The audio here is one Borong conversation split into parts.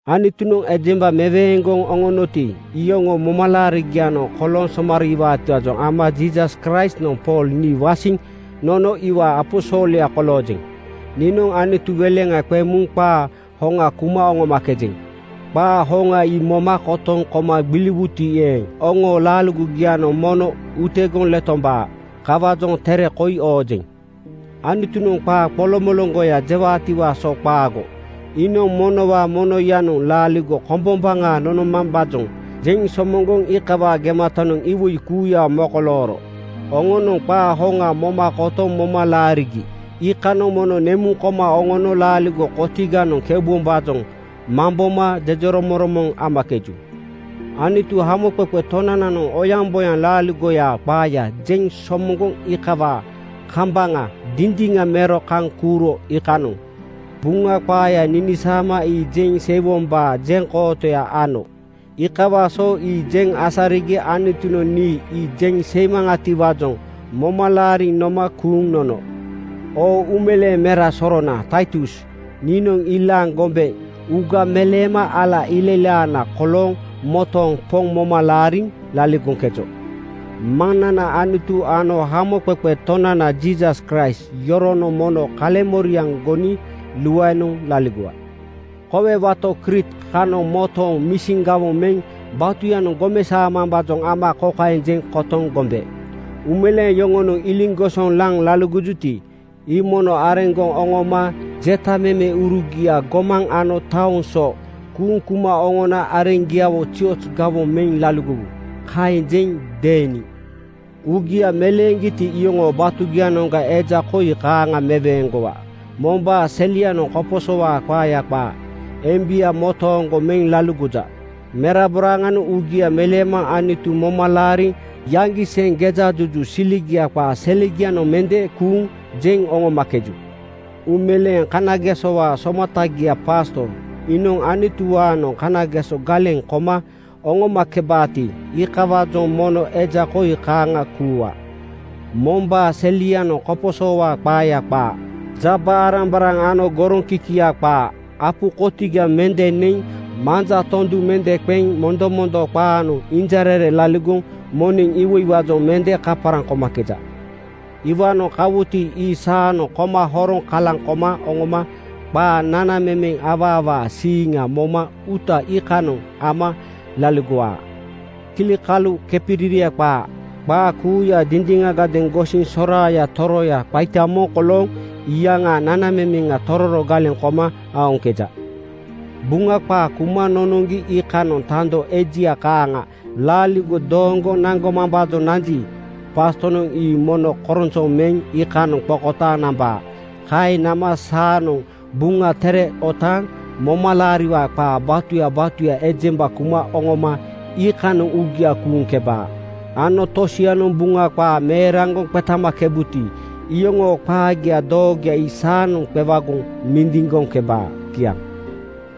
Anutunoŋ ejemba meweeŋgoŋ oŋonoti, iyoŋoo momalaarigianoŋ kolooŋ somariiwaatiwaajoŋ ama Jiisas Kraistnoŋ Pool nii wasiŋ nono iwaa aposolya koloojeŋ. Niinoŋ Anutu weleŋa qeŋ muŋ qaa hoŋa kuma oŋomakejeŋ. Qaa hoŋa ii moma kotoŋ koma gbiliwuti eeŋ, oŋoo laaligogianoŋ mono utegoŋ letomakebaa. Kawaajoŋ tere koi oojeŋ. Anutunoŋ qaa qoloŋmoloŋgoya jewaatiwaa so qaago, iinoŋ monowaa monoyanoŋ laaligo kombombaŋa nonomambaajoŋ jeŋ somoŋgoŋ iikawaa gematanoŋ iwoi kuuya mokolooro. Oŋonoŋ qaa hoŋa moma kotoŋ moma laarigi iikanoŋ mono nemuŋ koma oŋono laaligo kotiganoŋ keubombaajoŋ mamboma jejeromoŋromoŋ amakeju. Anutu, Hamoqeqe Tonananoŋ oyaŋboyaŋ laaligoyaa qaaya jeŋ somoŋgoŋ iikawaa kambaŋa dindiŋa mero kaŋ kuuro iikanoŋ Buŋa qaaya ninisaama ii jeŋ seiwombaa jeŋkootoya ano. Iikawaa so ii jeŋ asarigi Anutunoŋ nii ii jeŋ seimaŋatiwaajoŋ moma laariŋ noma kuuŋ nono. Oo uumeleeŋ mera sorona Taitus! Niinoŋ ilaaŋ gombe uuga meleema ala ilailaana kolooŋ motooŋ Poŋ moma laariŋ laligoŋkejo. Maŋnana Anutu ano Hamoqeqe Tonana Jiisas Kraist yoronoŋ mono kaleŋmoriaŋ goni luaenoŋ laligowa. Kowe wato Kriit (Crete) kanoŋ motooŋ misin gawoŋ meŋ batuyanoŋ gomesaomambaajoŋ ama kokaeŋ jeŋ kotoŋ gombe: “Uumeleeŋ yoŋonoŋ iliŋgosoŋ laŋ laligojuti, ii mono areŋgoŋ oŋoma (eja to pasto ano) jetamemeurugia gomaŋ ano taoŋ so kuuŋ kuma oŋona areŋgiawo zioz gawoŋ meŋ laligowu.” Kaeŋ jeŋ deeni. Uugia meleeŋgiti, iyoŋoo batugianoŋga eja koi kaaŋa meweeŋgowa: Mombaa selianoŋ koposowaa qaaya qaa, embia motooŋgo meŋ laligoja. Meraboraaŋanoŋ uugia meleema Anutu moma laariŋ yaŋgiseŋ gejajuju siligiaa qaa selegianoŋ mende kuuŋ jeŋ oŋomakeju. Uumeleeŋ kanagesowaa somatagia pasto (bisop) iinoŋ Anutuwaanoŋ kanageso galeŋ koma oŋomakebaati, iikawaajoŋ mono eja koi kaaŋa kuuwa: Mombaa selianoŋ koposowaa qaaya qaa, jaba-arambaraŋ ano goroŋkikia qaa. Apu kotiga mende neŋ manja tondu mende qeŋ mondomondo qaganoŋ injarere laligoŋ moneŋ iwoiwaajoŋ mende kaparaŋ komakeja. Iwaanoŋ kawuti, ii saanoŋ koma horoŋ kalaŋ koma oŋoma qaa nanamemeŋ awaawaa siiŋa moma uuta iikanoŋ ama laligowaa. Kilikalu kepiriria qaa, qaa kuuya dindiŋagadeeŋ gosiŋ soraaya toroya qaita moŋ kolooŋ iyaŋaa nanamemeŋa tororo galeŋ koma aoŋkeja. Buŋa qaa kuma nonoŋgi iikanoŋ tando ejia kaaŋa laaligo dooŋgoŋ naŋgomambaajoŋ nanji, pastonoŋ ii mono koronsoŋ meŋ iikanoŋ qokotaaŋ nambaa. Kaeŋ nama saanoŋ Buŋa Tere otaaŋ momalaariwaa qaa batuya batuya ejemba kuma oŋoma iikanoŋ uugia kuuŋkebaa ano tosianoŋ Buŋa qaa meeraŋgoŋ qetamakebuti, iyoŋoo qaagia doogoya ii saanoŋ qewagoŋ mindiŋgoŋkebaa. Kiaŋ.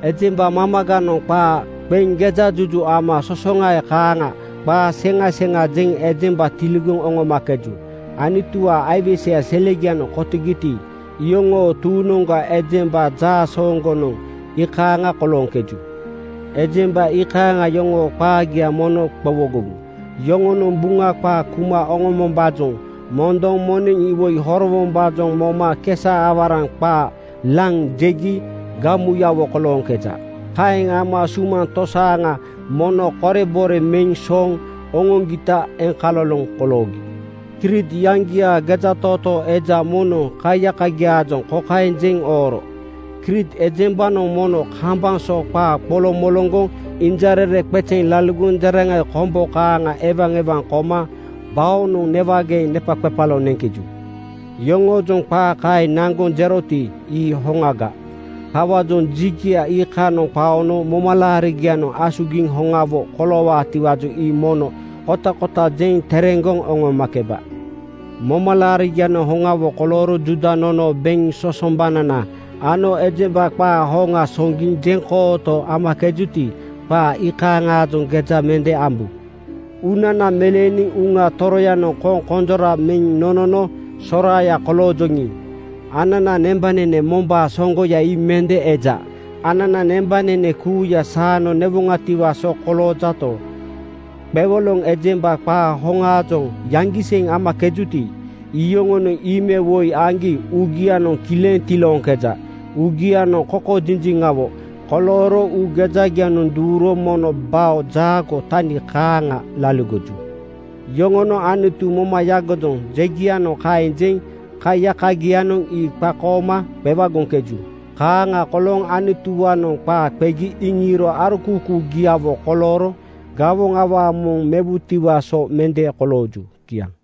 Ejemba mamaganoŋ qaa qeŋ gejajuju ama sosoŋae kaaŋa qaa seŋa seŋa jeŋ ejemba tiligoŋ oŋomakeju. Anutuwaa aiweseya selegianoŋ kotogiti, iyoŋoo tuuŋnoŋga ejemba jaasooŋgonoŋ iikaaŋa kolooŋkeju. Ejemba iikaaŋa yoŋoo qaagia mono qowogowu. Yoŋonoŋ Buŋa qaa kuma oŋombombaajoŋ mondoŋ moneŋ iwoi horowombaajoŋ moma kesa-awaraŋ qaa laŋ jegi gamuyawo kolooŋkeja. Kaeŋ ama sumaŋ tosaaŋa mono korebore meŋ sooŋ oŋoŋgita eŋkaloloŋ koloogi. Kriit iyaŋgiaa gejatootoo eja moŋnoŋ kaiyakagiaajoŋ kokaeŋ jeŋ ooro, “Kriit ejembanoŋ mono kambaŋ so qaa qoloŋmoloŋgoŋ injarere qezeŋ laligoŋ jeraŋai kombo kaaŋa ewaewaŋ koma baonoŋ newageeŋ nepaqepalo neŋkeju.” Yoŋoojoŋ qaa kaeŋ naŋgoŋ jeroti, ii hoŋaga. Kawaajoŋ jigia iikanoŋ qaono momalaarigianoŋ asugiŋ hoŋawo koloowaatiwaajoŋ ii mono kotakota jeŋ tereŋgoŋ oŋomakeba. Momalaarigianoŋ hoŋawo kolooro Juuda nonoo beŋ sosombanana ano ejemba qaa hoŋa soŋgiŋ jeŋkooto amakejuti, qaa iikaaŋaajoŋ geja mende ambu. Uunana meleeniŋ Uŋa Toroyanoŋ koŋkonjora meŋ nonono soraaya koloojoŋi, ananaa nembanene mombaa soŋgoya ii mende eja. Anana nembanene kuuya saanoŋ newoŋatiwaa so koloojato, qewoloŋ ejemba qaa hoŋaajoŋ yaŋgiseŋ amakejuti, iyoŋonoŋ ii me woi aŋgi uugianoŋ kileŋ tilooŋkeja. Uugianoŋ kokojinjiŋawo kolooro uu gejagia duuro mono bao jaagoo tani kaaŋa laligoju. Yoŋonoŋ “Anutu moma yagojoŋ,” jegianoŋ kaeŋ jeŋ kaiyakagianoŋ ii qakooma qewagoŋkeju. Kaaŋa kolooŋ Anutuwaanoŋ qaa qegi iŋiiro arokuukuugiawo kolooro gawoŋ awaa moŋ mewutiwaa so mende kolooju. Kiaŋ.